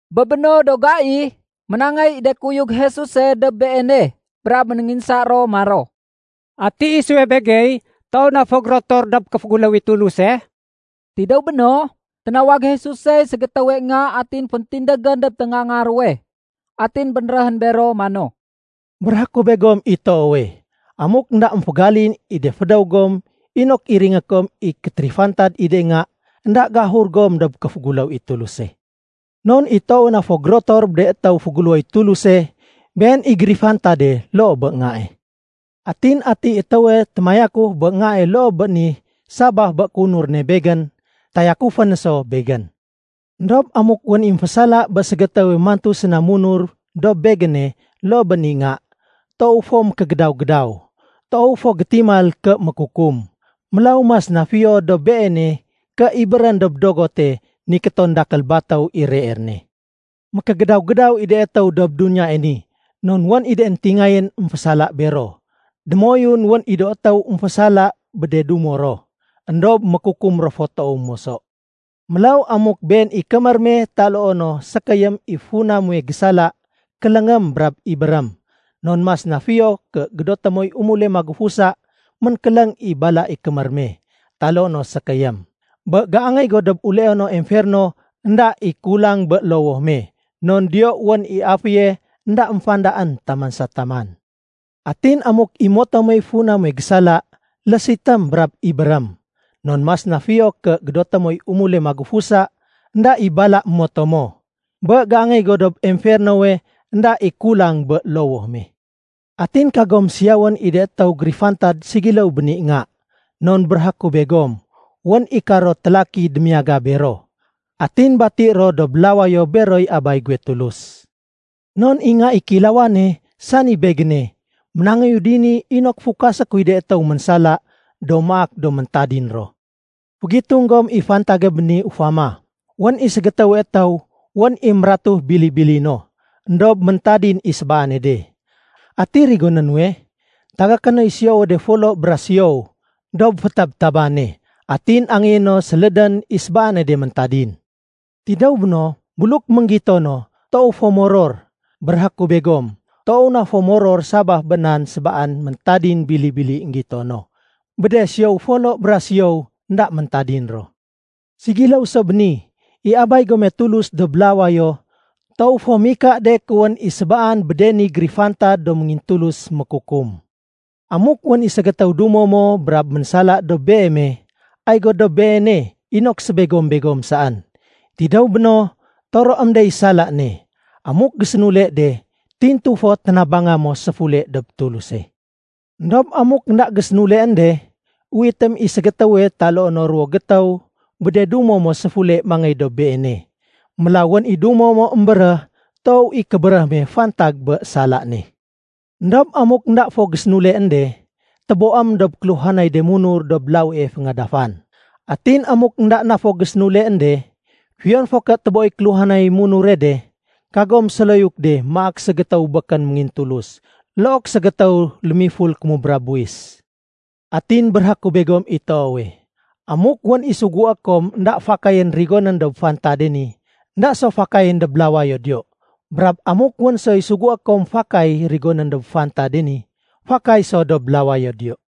Bé béno do gai, ménangéy i de kuyug Jesuse dob Beene brab ménénginsa ro maro, “Ati isuwe begey toow na fo gérotor dob kéféguléw i Tuluse?” Tidéw béno, ténawag Jesusey ségétéwe nga atin féntindégén dob téngaanga ruwe. Atin bénréhén bero mano, “Béréhé ku begom i toowe, amuk énda émfégalin i de fédéw gom inok iringé kom i kétérifantad i de nga, énda géahur gom dob kéféguléw i Tuluse. Non i toowe na fo gérotor bé de étéw féguléwoy Tuluse, been i gérifantade loo bé ngae. Atin atiy étéwe témayakuf bé ngae loo bé ni sabaf bé kéunur ne Begén, tayakufé no so Begén. “Endob amuk wén i émfésala bé ségétéwe mantu séna munur dob Begéne loo bé ni nga, toow fo mékégédaw-gédaw. Toow fo gétimal ké mékukum, mélaw mas na fiyo dob beene ké ibérén dob dogote nikéton dakél batéw i reer ne. Mékégédaw-gédaw i de étéw dob duniyae ni non wén i de éntingayén émfésala bero. Démoyun wén i do étéw émfésala bé de dumo ro. Endob mékukum ro fo toow moso. “Mélaw amuk been i kémér me taloo no sékéyém i funa muwe gésala, kéléngém brab ibérém. Non mas na fiyo ké gédoté moy umule magufusa ménkéléng i bala i kémér me taloo no sékéyém, bé géangéy go dob uleono emferno énda i kulang bé lowoh me. Non diyo wén i aféye énda émfandaén taman sa taman. Atin amuk i moto muwey funa muwe gésala, lésitém brab ibérém. Non mas na fiyo ké gédoté moy umule magufusa énda i bala moto mo, bé géangéy go dob emfernowe énda i kulang bé lowoh me. “Atin kagom siyawén i de étéw gérifantad segiléw bé ni nga. Non béréhé ku begom, wén i karo télaki démiyaga bero, atin bati ro dob lawayo beroy Abay guwe Tulus. Non i Nga i Kéilawane, sani Begéne, ménangéyu dini inok fukasé kuy de étéw ménsala do maak do méntadin ro. “Fégitung gom i fantage bé ni ufama. Wén i ségétéwe étéw wén i mératu bili-bili no. Endob méntadin i sébaane de. Ati rigoné nuwe? Tagaké noy siyowe de folo bra siyow dob fétabtabane, atin angéyé no sélédén i sébaane de méntadin. Tidéw béno, buluk énggito no, toow fo moror. Béréhé ku begom, toow na fo moror sabaf bé nan sébaan méntadin bili-bili énggito no bé de siyow de folo bra siyow énda méntadin ro. Ségiléw so bé ni, i Abay gome Tulus dob lawayo toow fo mika de ké wén i sébaan bé de ni gérifantad do méngintulus mékukum. “Amuk wén i ségétéw dumo mo brab ménsala dob beeme, ay go dob beene inok sébegom-begom saén. Tidéw béno, toroém dey sala ne. Amuk gésénule de, tintu fo ténabanga mo séfule dob Tuluse. Endob amuk énda gésénuleén de, uwitém i ségétéwe taloo no ruwo gétéw bé de dumo mo séfule mangéy dob beene. Mélaw wén i dumo mo émbéréh toow i kébéréh me fantag bé sala ne. Endob amuk énda fo gésénuleén de, téboém dob kéluhanay de munur dob lawie féngadafan. Atin amuk énda na fo gésénuleén de, fiyon fo ké téboéy kéluhanay munure de, kagom séloyuk de maak ségétéw békén méngintulus look ségétéw lémiful kémubra buwis. “Atin béréhé ku begom i toowe, amuk wén i sugué kom bé énda fakayén rigonén dob fantade ni, énda so fakayén dob lawayo diyo. Brab amuk wén soy sugué kom fakay rigonén dob fantade ni, fakay so dob lawayo diyo.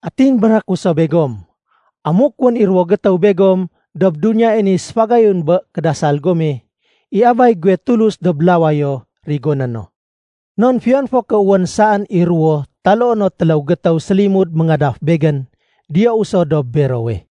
“Atin béréhé ku so begom, amuk wén i ruwo gétéw begom dob duniyae ni séfagayun bé kédasal gome, i Abay guwe Tulus dob lawayo rigoné no. Non fiyon fo ké wén saén i ruwo taloo no téléw gétéw sélimud méngadaf Begén, diyou so dob berowe.”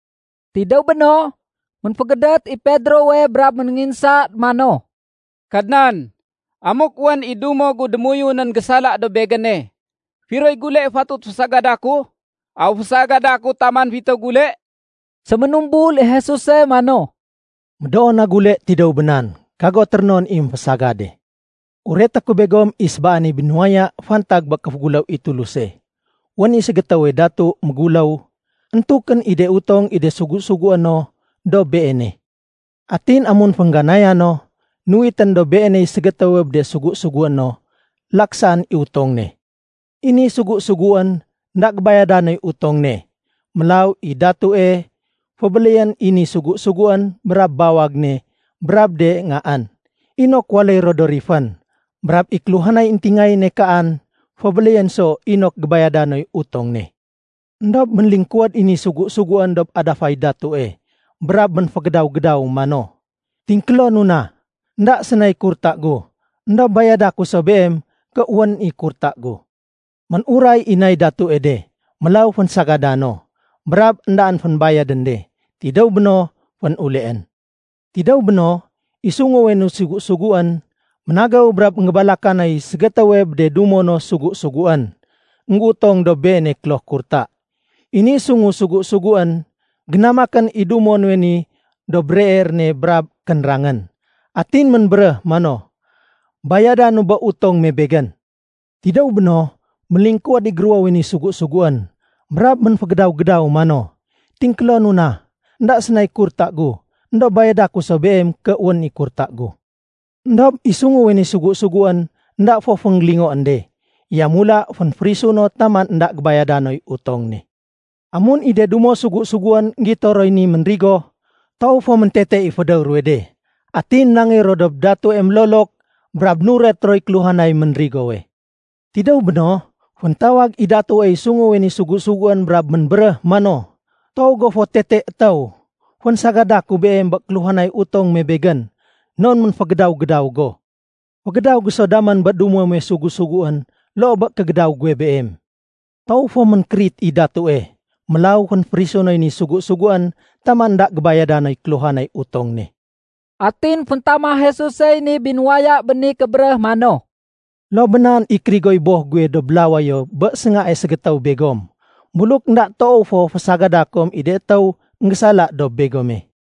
Tidéw béno, ménfégédét i Pedrowe brab ménénginsa mano, “Kadnan, amuk wén i dumo gu démoyunén gésala dob begéne, firoy gule fatut fésagada ku? Aw fésagada ku taman fitéw gule?” Séménumbul i Jesuse mano, “Médoo na gule tidéw bé nan. Kago térénon i émfésagade. Ureté ku begom i sébaane binuwaya fantag bé kéféguléw i Tuluse. Wén i ségétéwe datu méguléw, éntukén i de utong i de sugu-sugué no dob beene. Atin amun féngganaya no, nuwitén dob beeney ségétéwe bé de sugu-sugué no, laksaén i utong ne. I ni sugu-suguén énda gébayada noy utong ne. Mélaw i datue, fébéléyén i ni sugu-suguén brab bawag ne brab de ngaén, inok waléy ro do rifén. Brab i kéluhanay éntingayéne kaan, fébéléyén so inok gébayada noy utong ne. Endob ménlingkuwéd i ni sugu-suguén dob adafay datue, brab ménfégédaw-gédaw mano, ‘Tingkélonu na. Enda sénay kurta gu, éndob bayada ku so beem ké wén i kurta gu.’ Ménuray i nay datue de. Mélaw fénsagada no, brab éndaén fénbayadén de. Tidéw béno, fénuleén. “Tidéw béno, i sunguwe ni sugu-suguén ménagéw brab énggébalaka noy ségétéwe bé de dumo no sugu-suguén, énggéutong dob beene kloh kurta. I ni sungu sugu-suguén génamakén i dumo nuwe ni dob reer ne brab kénrangén. Atin ménbéréh mano, ‘Bayadanu bé utong me begén!’ Tidéw béno, ménlingkuwéd i géruwowe ni sugu-suguén, brab ménfégédaw-gédaw mano, ‘Tingkélonu na. Enda sénay kurta gu, éndob bayada ku so beem ké wén i kurta gu.’ Endob i sunguwe ni sugu-suguén énda fo fénggélingoén de. Yamula fénférisu no taman énda gébayada noy utong ne. Amun i de dumo sugu-suguén énggito roy ni ménrigo, toow fo méntete i fédéw ruwe de. Atin ménangéy ro dob datue ménlolok, brab nuret roy kéluhanay ménrigowe. Tidéw béno, féntawag i datuey sunguwe ni sugu-suguén brab ménbéréh mano, ‘Toow go fo tete étéw. Fénsagada ku beem bé kéluhanay utong me begén non ménfégédaw-gédaw go. Fégédaw go so damén bé dumo muwe sugu-suguén loo bé kégédaw guwe beem.’ Toow fo ménkérit i datue, mélaw fénférisu noy ni sugu-suguén taman énda gébayada noy kéluhanay utong ne.” Atin féntama Jesusey ni binuwaya bé ni kébéréh mano, “Loo bé nan i kérigoy Boh guwe dob lawayo bé séngae ségétéw begom, buluk énda toow fo fésagada kom i de étéw énggésala dob begome.”